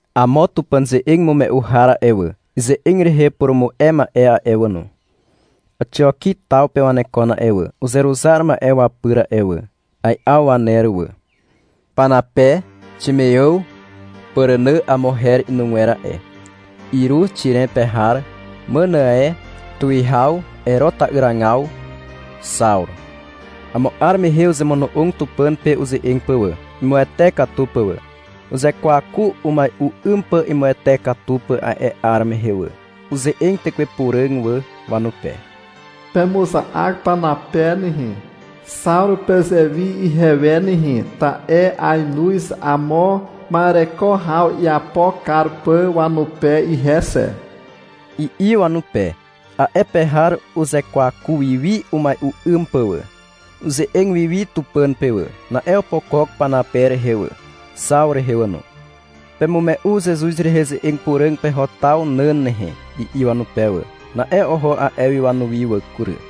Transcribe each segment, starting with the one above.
Amo Tupàn ze'eg imume'u har a'e wà, ize'eg rehe purumu'e ma'e a'e wà no, Àxioki taw pe wanekon a'e wà, uzeruzar ma'e wapyr a'e wà. Ai'aw waner wà. Panape, Ximeàw (Pàrànà amo her inugwer a'e), Iruz Xiren pe har, Mànàe Tuwihaw Ero ta'yragaw, Xawru. Amo 'ar mehe uzemono'og Tupàn pe uze'eg pà wà, imuwete katu pà wà. Uzekwaku umai'u 'ym pà imuwete katu pà a'e 'ar mehe wà. Uze'eg Tekwe Puràg wà wanupe. — Pemuza'ak Panape nehe, Xawru pezewi ihewe nehe, ta'e ainoz amo ma'ereko haw iapo kar pà wanupe ihe xe, i'i wanupe. A'e pe har uzekwaku wi wi umai'u 'ym pà wà. Uze'eg wi wi Tupàn pe wà. Na'e opokok Panape rehe wà, Xawru rehe wà no. — Pemume'u Zezuz rehe ze'eg puràg peho taw nàn nehe, i'i wanupe wà. Na'e oho a'e wi wanuwi wà kury.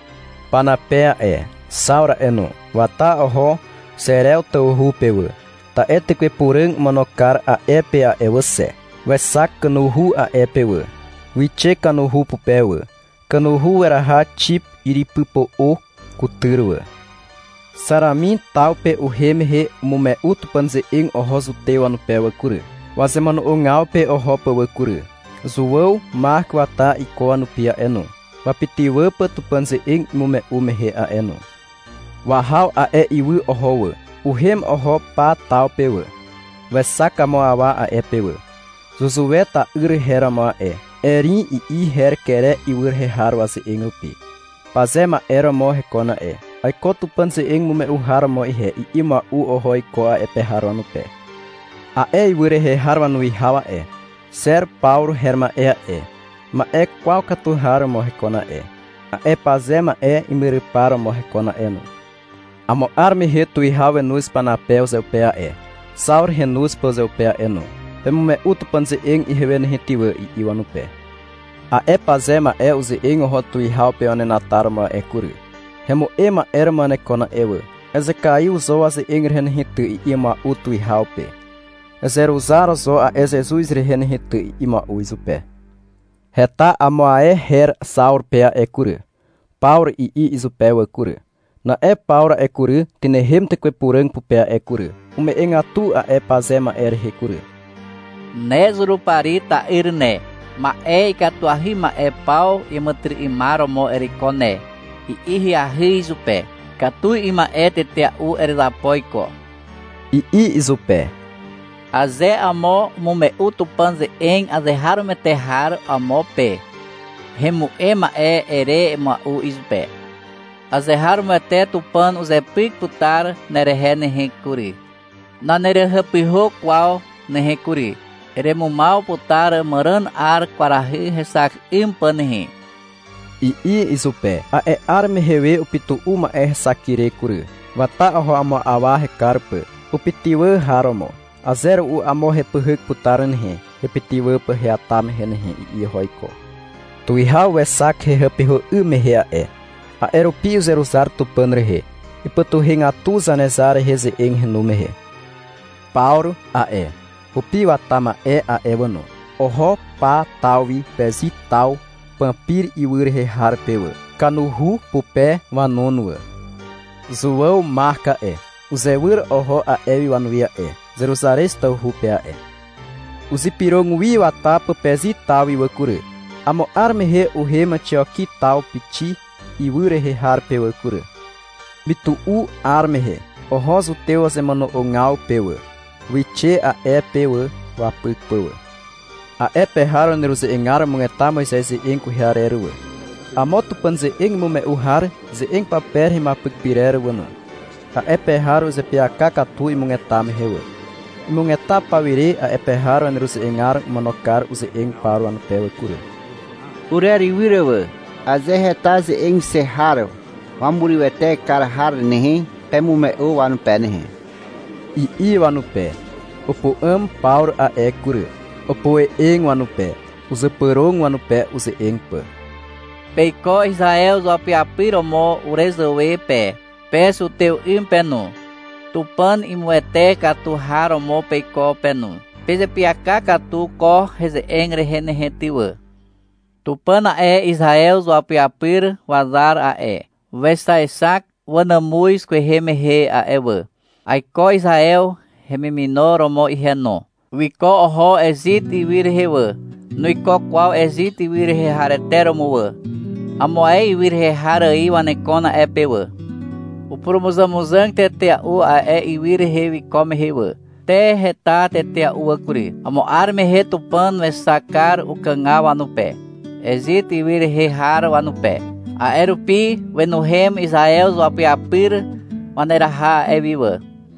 Panape a'e, Xawru a'e no, wata oho Xerew tawhu pe wà, ta'e Tekwe Puràg omono kar a'e pe a'e wà xe. Wexak kanuhu a'e pe wà. Wixe kanuhu pupe wà. Kanuhu weraha Xip yrypypo'o kutyr wà. Xaramin taw pe uhem mehe umume'u Tupàn ze'eg oho zutew wanupe wà kury, wazemono'ogaw pe oho pà wà kury. Zuàw Mak wata iko wanupi a'e no, wapytywà pà Tupàn ze'eg imume'u mehe a'e no. Wahaw a'e ywy oho wà. Uhem oho Pa taw pe wà. Wexak amo awa a'e pe wà. Zuzue ta'yr her romo a'e. — Erim, i'i her Kere ywy rehe har waze'eg rupi. Paze ma'e romo hekon a'e. — Aiko Tupàn ze'eg imume'u har romo ihe, i'i mua'u oho iko a'e pe har wanupe. A'e ywy rehe har wanuwihaw a'e, Xer Pawru her ma'e a'e, ma'e kwaw katu har romo hekon a'e. A'e paze ma'e imyrypar romo hekon a'e no. Amo 'ar mehe tuwihaw wenoz Panape uzeupe a'e, Xawru henoz pà uzeupe a'e no. — Pemume'u Tupàn ze'eg ihewe nehe ty wà, i'i wanupe. A'e paze ma'e uze'eg oho tuwihaw pe wanenataromo a'e kury. — Hemu'em ma'e romo wanekon a'e wà, ezekaiw zo waze'eg rehe nehe ty, i'i mua'u tuwihaw pe. — Ezeruzar zo a'e Zezuz rehe nehe ty, i'i mua'u izupe. (Heta amo ae her Xawru pe a'e kury. — Pawru, i'i izupe wà kury.) Na'e Pawru a'e kury, tynehem Tekwe Puràg pupe a'e kury. Ume'egatu a'e paze ma'e rehe kury. — Ne Zurupari ta'yr ne, ma'e ikatuahy ma'e paw iàmàtyry'ymar romo ereiko ne, i'i ahyahy izupe. — Ikatu 'ym ma'e tetea'u erezapo iko, i'i izupe. — Aze amo umume'u Tupàn ze'eg azeharomoete har amo pe, — Hemu'em ma'e, ere mua'u izupe. — Azeharomoete Tupàn uzepyk putar nerehe nehe kury. Nanerehàpyhà kwaw nehe kury. Eremumaw putar màràn 'ar kwarahy hexak 'ym pà nehe, i'i izupe. A'e 'ar mehe we upytu'u ma'e hexak ire kury. Wata oho amo awa hekar pà, upytywà har romo. — Aze ru'u amo hepyhyk putar nehe, hepytywà pà heata mehe nehe, i'i oho iko. Tuwihaw wexak hehàpyhà 'ym mehe a'e. A'e rupi uzeruzar Tupàn rehe. Ipytuhegatu Zanezar rehe ze'eg henu mehe. Pawru a'e, hupi wata ma'e a'e wà no, oho Pa taw wi Pezi taw Pampir ywy rehe har pe wà. Kanuhu pupe wanon wà. Zuàw Mak a'e, uzewyr oho a'e wi wanuwi a'e, Zeruzarez tawhu pe a'e. Uzypyrog wi wata pà Pezi taw wi wà kury. Amo 'ar mehe uhem Àxioki taw Pixi ywy rehe har pe wà kury. Mytu'u 'ar mehe oho zutew wazemono'ogaw pe wà. Wixe a'e pe wà wapyk pà wà. A'e pe har waneruze'egar umugeta Moizez ze'eg kwehe arer wà, amo Tupàn ze'eg imume'u har ze'eg pape rehe imuapyk pyrer wà no. A'e pe har uzeapyaka katu imugeta mehe wà. Imugeta pawire a'e pe har waneruze'egar omono kar uze'eg Pawru wanupe wà kury. — Urerywyr wà. Aze heta ze'eg xe har wamurywete kar har nehe, pemume'u wanupe nehe, i'i wanupe. Upu'àm Pawru a'e kury. Opoe'eg wanupe. Uzypyrog wanupe uze'eg pà. — Peiko Izaew izuapyapyr romo urezàwe pe. Pe zutew 'ym pe no, Tupàn imuwete katu har romo peiko pe no. Pezeapyaka katu ko heze'eg rehe nehe ty wà. Tupàn a'e, Izaew izuapyapyr wazar a'e, wexaexak wanàmuz kwehe mehe a'e wà. (Aiko Izaew hemimino romo ihe no.) Wiko oho Ezit ywy rehe wà. Nuiko kwaw Ezit ywy rehe harete romo wà. Amo ae ywy rehe har ài wanekon a'e pe wà. Upurumuzàmuzàg tetea'u a'e ywy rehe wiko mehe wà. Te, heta tetea'u wà kury. Amo 'ar mehe Tupàn wexak kar ukàgaw wanupe, Ezit ywy rehe har wanupe. A'e rupi wenuhem Izaew izuapyapyr waneraha a'e wi wà.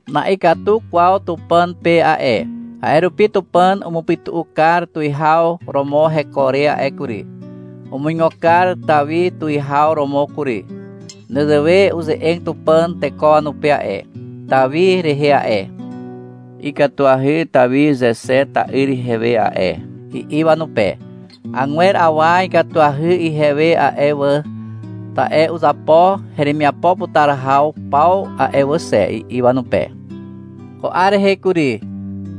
Na'ikatu kwaw Tupàn pe a'e. A'e rupi Tupàn umupytu'u kar tuwihaw romo heko re a'e kury. Umuigo kar Tawi tuwihaw romo kury. Nezewe uze'eg Tupàn teko wanupe a'e, Tawi rehe a'e. — Ikatuahy Tawi Zexe ta'yr ihewe a'e, i'i wanupe. — Agwer awa ikatuahy ihewe a'e wà, ta'e uzapo heremiapo putar haw paw a'e wà xe, i'i wanupe. Ko 'ar rehe kury,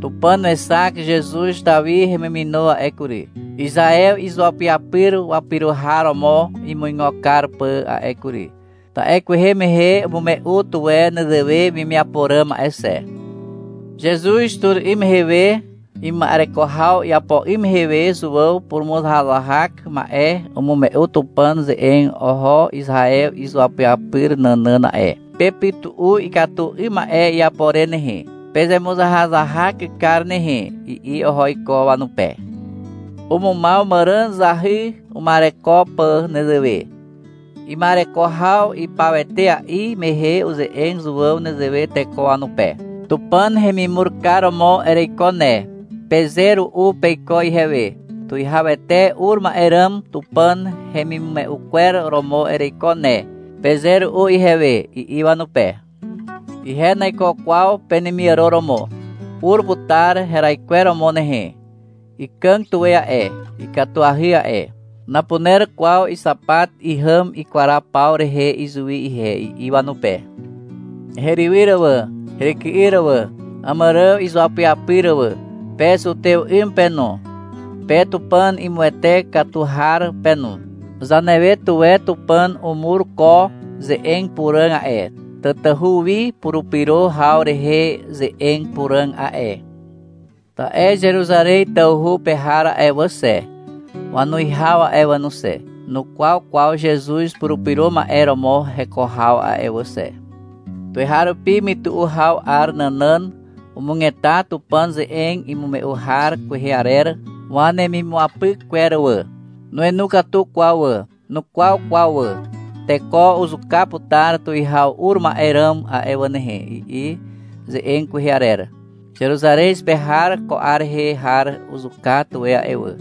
Tupàn wexak Zezuz Tawi hemimino a'e kury, Izaew izuapyapyr wapyro har romo imuigo kar pà a'e kury. Ta'e kwehe mehe umume'u tuwe nezewe wemiapo ràm a'e xe. Zezuz tur 'ym mehe we ima'ereko haw iapo 'ym mehe we Zuàw purumuzahak ma'e umume'u Tupàn ze'eg oho Izaew izuapyapyr nànàn a'e. — Pepytu'u ikatu 'ym ma'e iapo re nehe. Pezemuzahazahak kar nehe, i'i oho iko wanupe. Umumaw màràn zahy uma'ereko pà nezewe. Ima'ereko haw ipaw etea'i mehe uze'eg Zuàw nezewe teko wanupe. — Tupàn hemimur kar romo ereiko ne, peze ru'u peiko ihewe. — Tuwihawete ur ma'e ràm Tupàn hemimume'u kwer romo ereiko ne, peze ru'u ihewe, i'i wanupe. — Ihe naiko kwaw penemiàro romo. Ur putar heraikweromo nehe. Ikàg tuwe a'e, ikatuahy a'e. Napuner kwaw ixapat ihàm ikwaraw paw rehe izuwi ihe, i'i wanupe. Herywyr wà heryky'yr wà, Àmàrààw izuapyapyr wà. Pe zutew 'ym pe no, pe Tupàn imuwete katu har pe no. Zanewe tuwe Tupàn umur ko ze'eg puràg a'e, tatahu wi purupyro haw rehe ze'eg puràg a'e. Ta'e Zeruzarez tawhu pe har a'e wà xe, wanuwihaw a'e wà no xe, nukwaw kwaw Zezuz Purupyro Ma'e romo heko haw a'e wà xe. Tuweharupi mytu'u haw 'ar nànàn umugeta Tupàn ze'eg imume'u har kwehe arer wanemimuapyk kwer wà. Nuenu katu kwaw wà. Nukwaw kwaw wà. — Teko uzuka putar tuwihaw ur ma'e ràm a'e wà nehe, i'i ze'eg kwehe arer. Zeruzarez pe har ko 'ar rehe har uzuka tuwe a'e wà,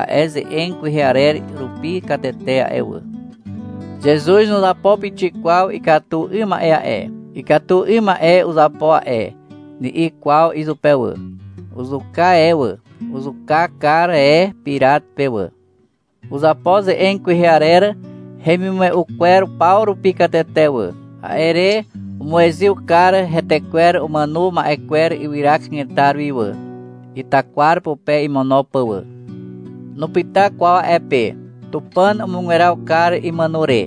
a'e ze'eg kwehe arer rupi katete a'e wà. Zezuz nuzapo pixik kwaw ikatu 'ym ma'e a'e. — Ikatu 'ym ma'e uzapo a'e, ni'i kwaw izupe wà. Uzuka e wà. Uzuka kar e Pirat pe wà. Uzapo ze'eg kwehe arer hemimume'u kwer paw rupi katete wà. A'e re umuezyw kar hetekwer umàno ma'e kwer ywyra kanetar wi wà, itakwar pupe imono pà wà. Nupyta kwaw a'e pe. Tupàn umugweraw kar imàno re.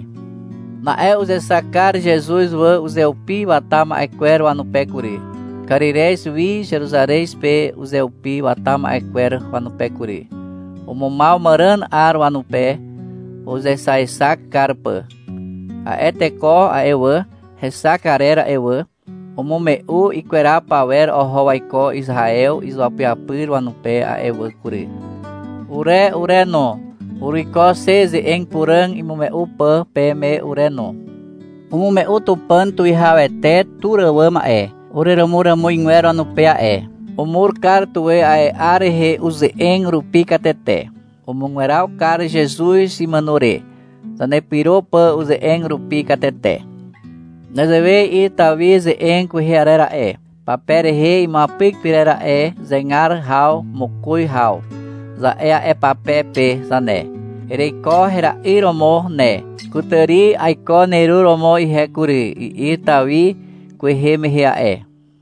Na'e uzexak kar Zezuz wà uzeupi wata ma'e kwer wanupe kury, Karirez wi Zeruzarez pe uzeupi wata ma'e kwer wanupe kury. Umumaw màràn 'ar wanupe uzexazexak kar pà. A'e teko a'e wà, hexak arer a'e wà, umume'u ikweraw pawer oho waiko Izaew izuapyapyr wanupe a'e wà kury. Ure ure no, uruiko xe ze'eg puràg imume'u pà peme ure no. Umume'u Tupàn tuwihawete tur àwàm a'e, ureràmuràmuzgwer wanupe a'e. Umur kar tuwe a'e 'ar rehe uze'eg rupi katete. Umugweraw kar Zezuz imàno re, zanepyro pà uze'eg rupi katete. Nezewe i'i Tawi ze'eg kwehe arer a'e, pape rehe imuapyk pyrer a'e (Zegar haw mokoz haw, za'e a'e pape pe zane). — Ereiko hera'yr romo ne. Kutàri aiko neru romo ihe kury, i'i Tawi kwehe mehe a'e.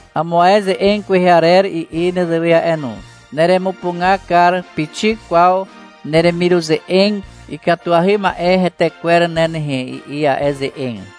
Amo ae ze'eg kwehe arer i'i nezewe a'e no. — Neremupuga kar pixik kwaw neremiruze'eg ikatuahy ma'e retekwer ne nehe, i'i a'e ze'eg.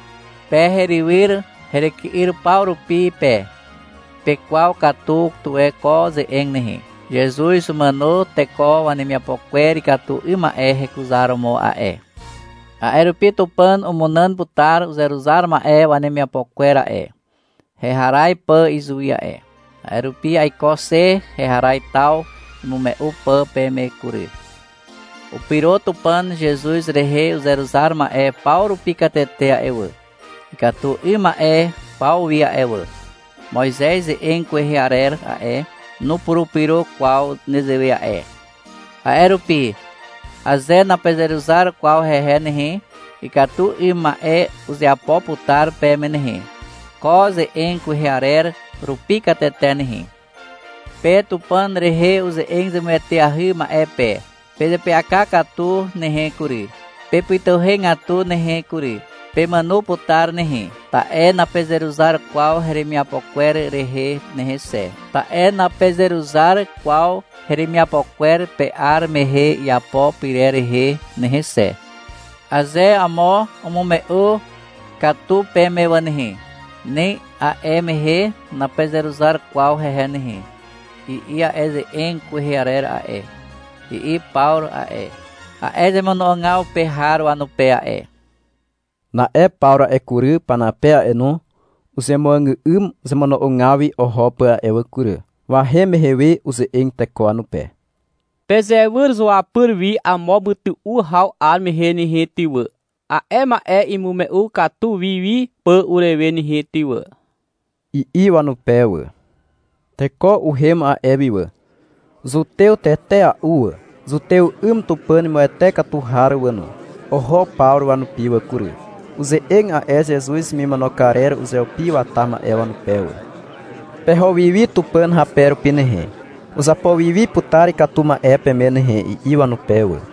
Pe herywyr heryky'yr paw rupi pe, pekwaw katu tuwe ko ze'eg nehe. Zezuz umàno teko wanemiapo kwer ikatu 'ym ma'e hekuzaromo a'e. A'e rupi Tupàn umunàn putar uzeruzar ma'e wanemiapo kwer a'e, heharaz pà izuwi a'e. A'e rupi aiko xe heharaz taw imume'u pà peme kury. Upyro Tupàn Zezuz rehe uzeruzar ma'e paw rupi katete a'e wà, ikatu 'ym ma'e paw wi a'e wà. Moizez ze'eg kwehe arer a'e, nupurupyro kwaw nezewe a'e. A'e rupi, aze napezeruzar kwaw hehe nehe, ikatu 'ym ma'e uzeapo putar peme nehe, ko ze'eg kwehe arer rupi katete nehe. — Pe Tupàn rehe uze'eg zemueteahy ma'e pe. Pezeapyaka katu nehe kury. Pepytuhegatu nehe kury. Pemàno putar nehe. Ta'e napezeruzar kwaw heremiapo kwer rehe nehe xe, ta'e napezeruzar kwaw heremiapo kwer pe 'ar mehe iapo pyrer rehe nehe xe. Aze amo umume'u katu peme wà nehe, ni a'e mehe napezeruzar kwaw hehe nehe, i'i a'e ze'eg kwehe arer a'e, i'i Pawru a'e, a'e zemono'ogaw pe har wanupe a'e. Na'e Pawru a'e kury, Panape a'e no, uzemuàgà'ym zemono'ogaw wi oho pà a'e wà kury. Wahem mehe we uze'eg teko wanupe. — Pezewyr zuapyr wi amo mytu'u haw 'ar mehe nehe ty wà, a'e ma'e imume'u katu wi wi pà urewe nehe ty wà, i'i wanupe wà. Teko uhem a'e wi wà. Zutew tetea'u wà, zutew 'ym Tupàn imuwete katu har wà no, oho Pawru wanupi wà kury. Uze'eg a'e Zezuz hemimono karer uzeupi wata ma'e wanupe wà. — Peho wi wi Tupàn hape rupi nehe. Uzapo wi wi putar ikatu ma'e peme nehe, i'i wanupe wà.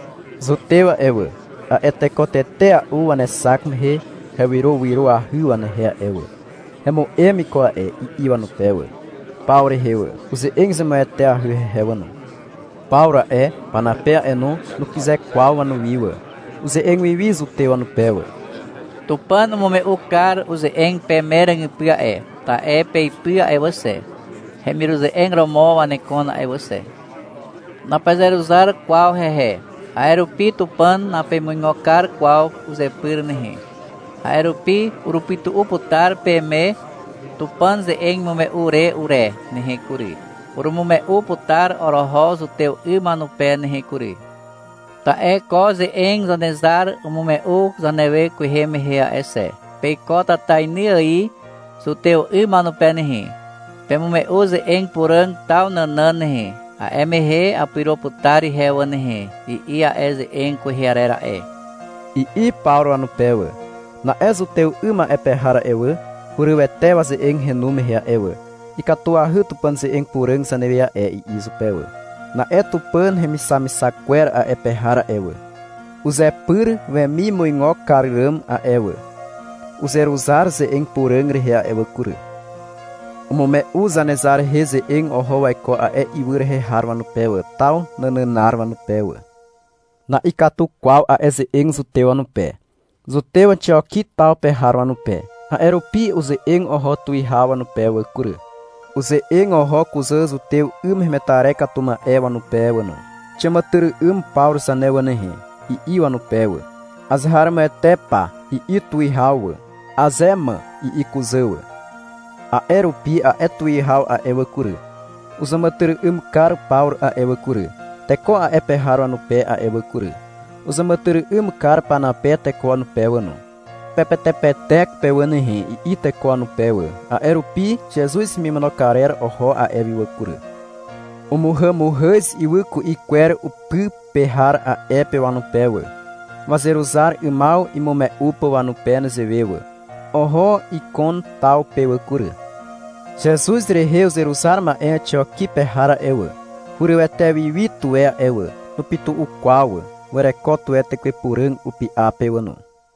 Zutew a'e wà, a'e teko tetea'u wanexak mehe hewyrowyroahy wanehe a'e wà. — Hemu'em iko a'e, i'i wanupe wà, Pawru rehe wà. Uze'eg zemueteahy hehe wà no. Pawru a'e, Panape a'e no, nukyze kwaw wanuwi wà. Uze'eg wi wi zutew wanupe wà. — Tupàn umume'u kar uze'eg peme ràgypy a'e, ta'e peipy a'e wà xe, hemiruze'eg romo wanekon a'e wà xe. Napezeruzar kwaw hehe. A'e rupi Tupàn napemuigo kar kwaw uzepyr nehe. A'e rupi urupytu'u putar peme Tupàn ze'eg imume'u re ure nehe kury. Urumume'u putar oroho zutew 'ym wanupe nehe kury. Ta'e ko ze'eg Zanezar umume'u zanewe kwehe mehe a'e xe. — Peiko tatainy ài zutew 'ym wanupe nehe. Pemume'u ze'eg puràg taw nànàn nehe, A'e mehe apyro putar ihe wà nehe, i'i a'e ze'eg kwehe arer a'e, i'i Pawru wanupe wà. Na'e zutew 'ym a'e pe har a'e wà, hurywete waze'eg henu mehe a'e wà. — Ikatuahy Tupàn ze'eg puràg zanewe a'e, i'i izupe wà. Na'e Tupàn hemixamixak kwer a'e pe har a'e wà, uzepyr wemimuigo kar ràm a'e wà, uzeruzar ze'eg puràg rehe a'e wà kury. Umume'u Zanezar rehe ze'eg oho waiko a'e ywy rehe har wanupe wà, taw nànànar wanupe wà. Na'ikatu kwaw a'e ze'eg zutew wanupe, zutew Àxioki taw pe har wanupe. A'e rupi uze'eg oho tuwihaw wanupe wà kury. Uze'eg oho kuzà zutew 'ym hemetarer katu ma'e wanupe wà no. — Xiàmàtyry'ym Pawru zane wà nehe, i'i wanupe wà. — Azeharomoete pa, i'i tuwihaw wà. — Aze ma, i'i kuzà wà. A'e rupi a'e tuwihaw a'e wà kury, uzàmàtyry'ym kar Pawru a'e wà kury, teko a'e pe har wanupe a'e wà kury. Uzàmàtyry'ym kar Panape teko wanupe wà no. — Pepetepetek pe wà nehe, i'i teko wanupe wà. A'e rupi Zezuz hemimono karer oho a'e wi wà kury. Umuhàmuhàz ywy ku'i kwer upy pe har a'e pe wanupe wà, wazeruzar 'ymaw imume'u pà wanupe nezewe wà. Oho Ikon taw pe wà kury. Zezuz rehe uzeruzar ma'e Àxioki pe har a'e wà, hurywete wi wi tuwe a'e wà. (Nupytu'u kwaw wà.) Wereko tuwe Tekwe Puràg upy'a pe wà no.